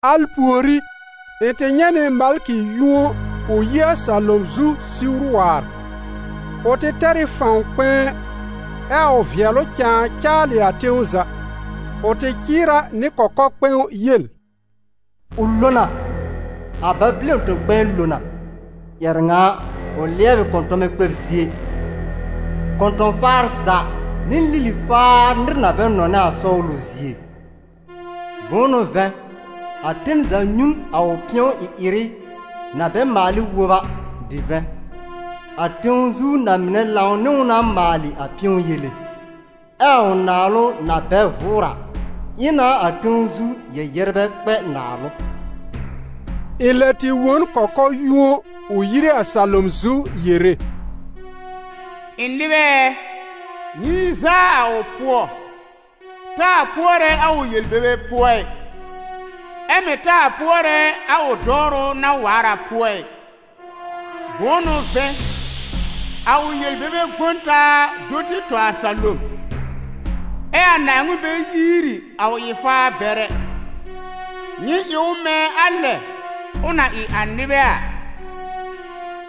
Al pùorí, ɩ̃ tɩ nyɛ̃ nɩ malkɩ yũo ʋ yi a salom zu siwr waar. Ʋ tɩ tɛr ɩ fãw kpɛ̃ɛ, ɛ a ʋ vɩɛlʋ cãa caalɩ a tẽw za. Ʋ tɩ cɩɩr a nɩ kɔkɔ-kpɛ̃w yel: «Ʋ lo na! A Babɩlɔn tẽ-kpɛ̃ɛ kpɛ̃ɛ lo na! Ƴɛrɛ ŋa a, ʋ lɩɛb ɩ kɔ̃tɔmɛ kpɛb zie, kɔ̃tɔ̃-faar za nɩ lili-faar nɩr na bɛ nɔnɛ a sɔwlʋ zie. Bʋ̃ʋ n'ʋ vɛ̃, a ten za nyũ n a ʋ pɩ̃ɔ-ɩ-ɩrɩ na bɛ maal ɩ wob a divɛ̃. A tẽw zu na-mɩnɛ lãw nɩ ʋ na maalɩ a pɩ̃ɔ yele, ɛ a ʋ naalʋ, na bɛ vʋʋr a, ɩ na a tẽw zu yɛ-yɛrbɛ kpɛ naalʋ.» Ɩ̃ lɛ tɩ wõ n kɔkɔ-yũo ʋ yire a salom zu yere: «Ɩ̃ nɩbɛ ɛ, nyɩ yi zaa a ʋ pʋɔ, taa pʋɔrɛ a ʋ yel-bebe pʋɔ ɩ, ɛ́ mɩ̀ taa pʋɔrɛ a ʋ dɔwrʋ na waar a pʋɔ ɩ. Bʋ̃ʋ n'ʋ vɛ̃, a ʋ yel-bebe gbõ n taa do tɩ tɔ a salom, ɛ a Naaŋmɩn bɛ yiiri a ʋ ɩ-faar bɛr ɛ. Nyɩ ɩ ʋ mɛ̃ a lɛ ʋ na ɩ a nɩbɛ a,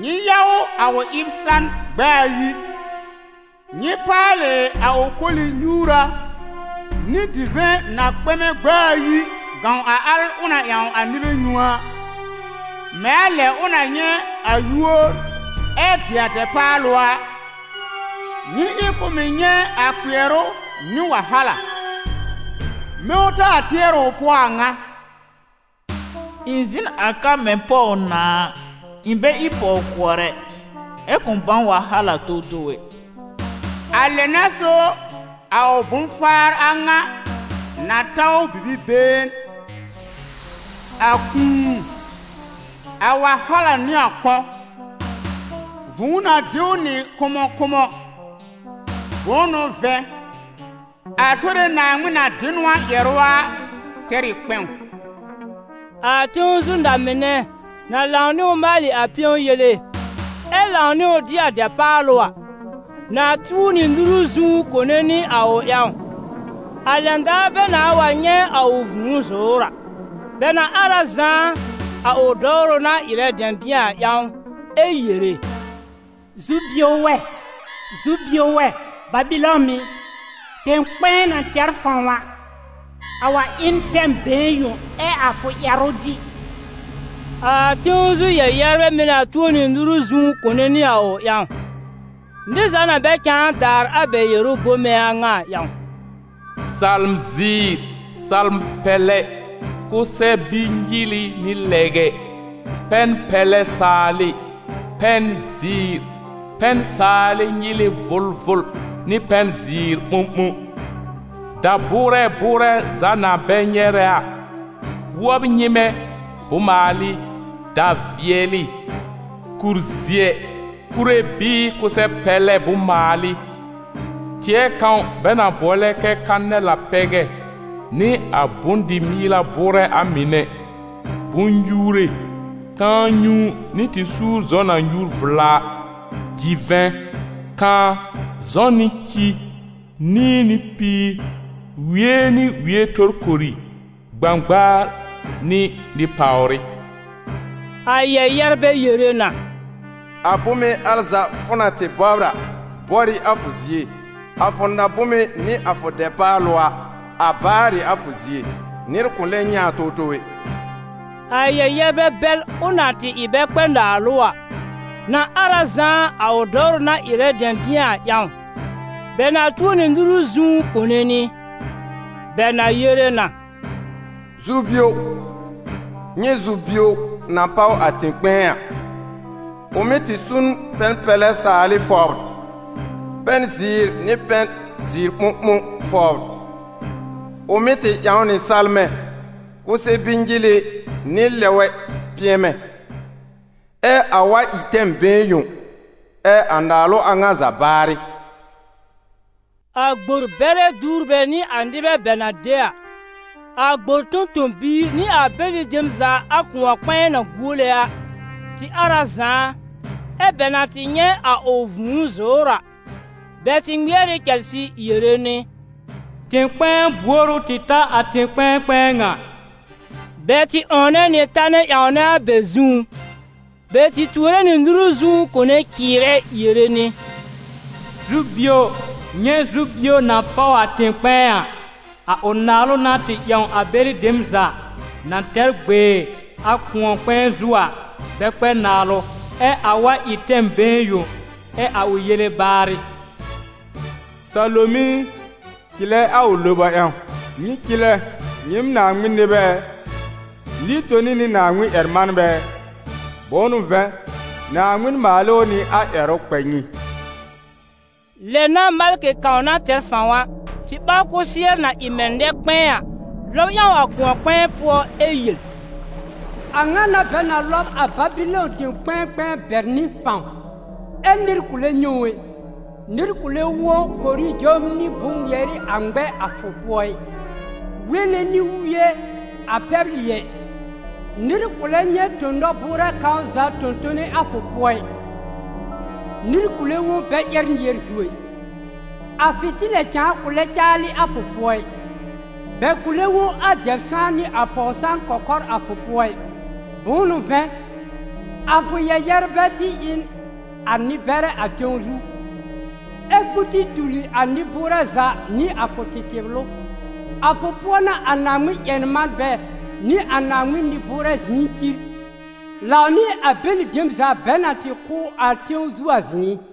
nyɩ ya ʋ a ʋ ɩb san gb'a ayi. Nyɩ paalɩ a ʋ koli-nyuura nɩ divɛ̃ na kpɛmɛ gb'a ayi gãw a al ʋ na ƴãw a nɩbɛ nyũ a. Mɛ̃ a lɛ ʋ na nyɛ̃ a yúor ɛ dɩ a dɛpaalʋ a, nyɩ ɩ k'ʋ mɩ̀ nyɛ̃ a kpɩɛrʋ nɩ wahala. Mɛ̃ ʋ taa tɩɛr ɩ ʋ pʋɔ a ŋa: ‹Ɩ̃ zɩ̃ n a ka mɛ̃ pɔw-nãa a, ɩ̃ bɛ ɩ pɔw-kʋɔr ɛ, ɛ́ kʋ̃ bãw wahala towtow ɛ.› A lɛ n'a so a ʋ bʋ̃-faar a ŋa na ta ʋ bibi-been: a kũu, a wahala nɩ a kɔ̃; vũu na dɩ ʋ nɩ kʋmɔkʋmɔ. Bʋ̃ʋ n'ʋ vɛ̃, a Sore Naaŋmɩn na dɩ n ʋ a ƴɛrʋ a tɛr ɩ kpɛ̃w.» A tẽw zu na-mɩnɛ, na lãw nɩ ʋ maalɩ a pɩ̃ɔ yele, ɛ lãw nɩ ʋ dɩ a dɛpaalʋ a, na tuo nɩ nuru zũú kone nɩ a ʋ ƴãw, a lɛn daar bɛ nãa wa nyɛ̃ a ʋ vũu zʋ̀ʋ́r a. Bɛ na ar a zãá, a ʋ dɔwrʋ na ɩrɛ dɛ̃bɩ̃ɛ a ƴãw, ɛ yere: «Zu-bio wɛ! Zu-bio wɛ! Babɩlɔn ɩ, tɛ̃-kpɛ̃ɛ na tɛr fãw a! A wa ɩ n tɛm been yõ ɛ a fʋ ƴɛrʋ dɩ!» A tẽw zu yɛ-yɛrbɛ mɩ̀ na tuo nɩ nuru zũú kone nɩ a ʋ ƴãw, nɩr za na bɛ cãa daar a bɛ yɛrʋ bome a ŋa a ƴãw: salm-zɩɩr, salm-pɛlɛ, kʋsɛ-bi-nyɩlɩ nɩ lɛgɛ, pɛn-pɛlɛ saalɩ, pɛn-zɩɩr, pɛn-saalɩ nyɩlɩ vʋlvʋl nɩ pɛn-zɩɩr ɓõɓõ; da-bʋʋrɛ bʋʋrɛ za na bɛ nyɛrɛ a, wɔ́b nyɩ́mɛ́ bʋ̃-maalɩ, da-vɩɛlɩ, kur-zɩɛ, kure bɩɩ kʋsɛ-pɛlɛ bʋ̃-maalɩ; tɩɛ kãw bɛ na bʋɔlɛ kɛ kanɛl a pɛgɛ nɩ a bʋ̃-dɩ-mɩɩla bʋʋrɛ a mɩnɛ, bʋ̃-nyuure, kãa-nyũu nɩ tɩ-suúr-zɔ̃ na nyùur vla a; divɛ̃, kãá, zɔ̃ nɩ ci; nĩi nɩ píir, wie nɩ wie torkori, gbãgbaar nɩ nɩ-pàwrɩ. A yɛ-yɛrbɛ yere na: «A bome al za fʋ na tɩ bɔbr a, bɔr ɩ a fʋ zie, a fʋ na-bome nɩ a fʋ dɛpaalʋ a, a baar ɩ a fʋ zie, nɩr kʋ̃ lɛ nyɛ̃ a towtow ɛ!» A yɛ-yɛrbɛ bɛl, ʋ na tɩ ɩ bɛ kpɛ naalʋ a, na ar a zãá, a ʋ dɔwrʋ na ɩrɛ bɛ dɛ̃bɩ̃ɛ a ƴãw; bɛ na tuo nɩ nuru zũú kone nɩ; bɛ na yere na: «Zu-bio! Nyɛ̃ zu-bio na páw a tẽ-kpɛ̃ɛ a! Ʋ mɩ́ tɩ su n pɛn-pɛlɛ saalɩ fɔbr, pɛn-zɩɩr nɩ pɛn-zɩɩr-ɓõɓõ fɔbr, ʋ mɩ́ tɩ ƴãw nɩ salmɛ, kʋsɛ-bi-nyɩlɩ nɩ lɛgɛ pɩ̃ɛmɛ. Ɛ a wa ɩ tɛm been yõ, ɛ a naalʋ a ŋa za baarɩ!» A gbor-bɛrɛ duwrbɛ nɩ a nɩbɛ bɛ na mɩ́ de a, a gbor tõ-tõ-biir nɩ a bɛlɩ dem za a kʋ̃ɔ-kpɛ̃ɛ na guole a, tɩ ar a zãá, ɛ́ bɛ na tɩ nyɛ̃ a ʋ vũu zʋ̀ʋ́r a, bɛ tɩ ŋmɩɛr ɩ cɛlsɩ yere nɩ: «Tẽ-kpɛ̃ɛ buor ʋ tɩ ta a tẽ-kpɛ̃ɛ kpɛ̃ɛ ŋa?» Bɛ tɩ 'wɔ̃wnɛ nɩ tanɛ ƴãwnɛ a bɛ zũú, bɛ tɩ tuore nɩ nuru zũú kone cɩɩrɛ yere nɩ: «Zu-bio! Nyɛ̃ zu-bio na páw a tẽ-kpɛ̃ɛ a! A ʋ naalʋ n'a tɩ ƴãw a bɛlɩ dem za, na tɛr gbee a kʋ̃ɔ-kpɛ̃ɛ zu a, bɛ kpɛ naalʋ. Ɛ a wa ɩ tɛm been yõ, ɛ a ʋ yele baarɩ!» Salom i, cɩlɛ a ʋ loba ƴãw! Nyɩ cɩlɛ, nyɩɩm Naaŋmɩn nɩbɛ ɛ, nɩ-toni nɩ Naaŋmɩn-ƴɛr-manbɛ ɛ! Bʋ̃ʋ n'ʋ vɛ̃, Naaŋmɩn maal ɩ ʋ nɩ a ƴɛrʋ kpɛ nyɩ. Lɛ n'a, malkɩ kãw na tɛr fãw a, tɩ ɓaw kʋsɩɛr, na ɩ mɛ̃ nɛ-kpɛ̃ɛ a, lɔb ƴãw a kʋ̃ɔ-kpɛ̃ɛ pʋɔ ɛ yel: «A ŋa n'a bɛ na lɔb a Babɩlɔn tẽ-kpɛ̃ɛ kpɛ̃ɛ bɛr nɩ fãw, ɛ́ nɩr kʋ̃ lɛ nyɛ̃ ʋ ɛ. Nɩr kʋ̃ lɛ wõ korijom nɩ bʋ̃-ŋmɩɛrɩ a ŋmɛ a fʋ pʋɔ ɩ, wele nɩ wɩ́ɛ a pɛblɩ ɛ. Nɩr kʋ̃ lɛ nyɛ̃ tõ-nɔ-bʋʋrɛ kãw za tõ-tone a fʋ pʋɔ ɩ; nɩr kʋ̃ lɛ wõ bɛ ƴɛ́r nɩɛr zu ɛ. A fɩ̃tɩlɛ cãa kʋ̃ lɛ caalɩ a fʋ pʋɔ ɩ; bɛ kʋ̃ lɛ wõ a dɛb-sãan nɩ a pɔw-sãan kɔkɔr a fʋ pʋɔ ɩ. Bʋ̃ʋ n'ʋ vɛ̃, a fʋ yɛ-yɛrbɛ tɩ ɩ n a nɩ-bɛrɛ a tẽw zu, ɛ́ fʋ tɩ tuli a nɩ-bʋʋrɛ za nɩ a fʋ tɩtɩblʋ.» A fʋ pʋɔ n'a a Naaŋmɩn-ƴɛr-manbɛ nɩ a Naaŋmɩn nɩ-bʋʋrɛ zɩ̃ɩ cir, lãw nɩ a bɛlɩ dem za bɛ na tɩ kʋ́ a tẽw zu a zɩ̃ɩ.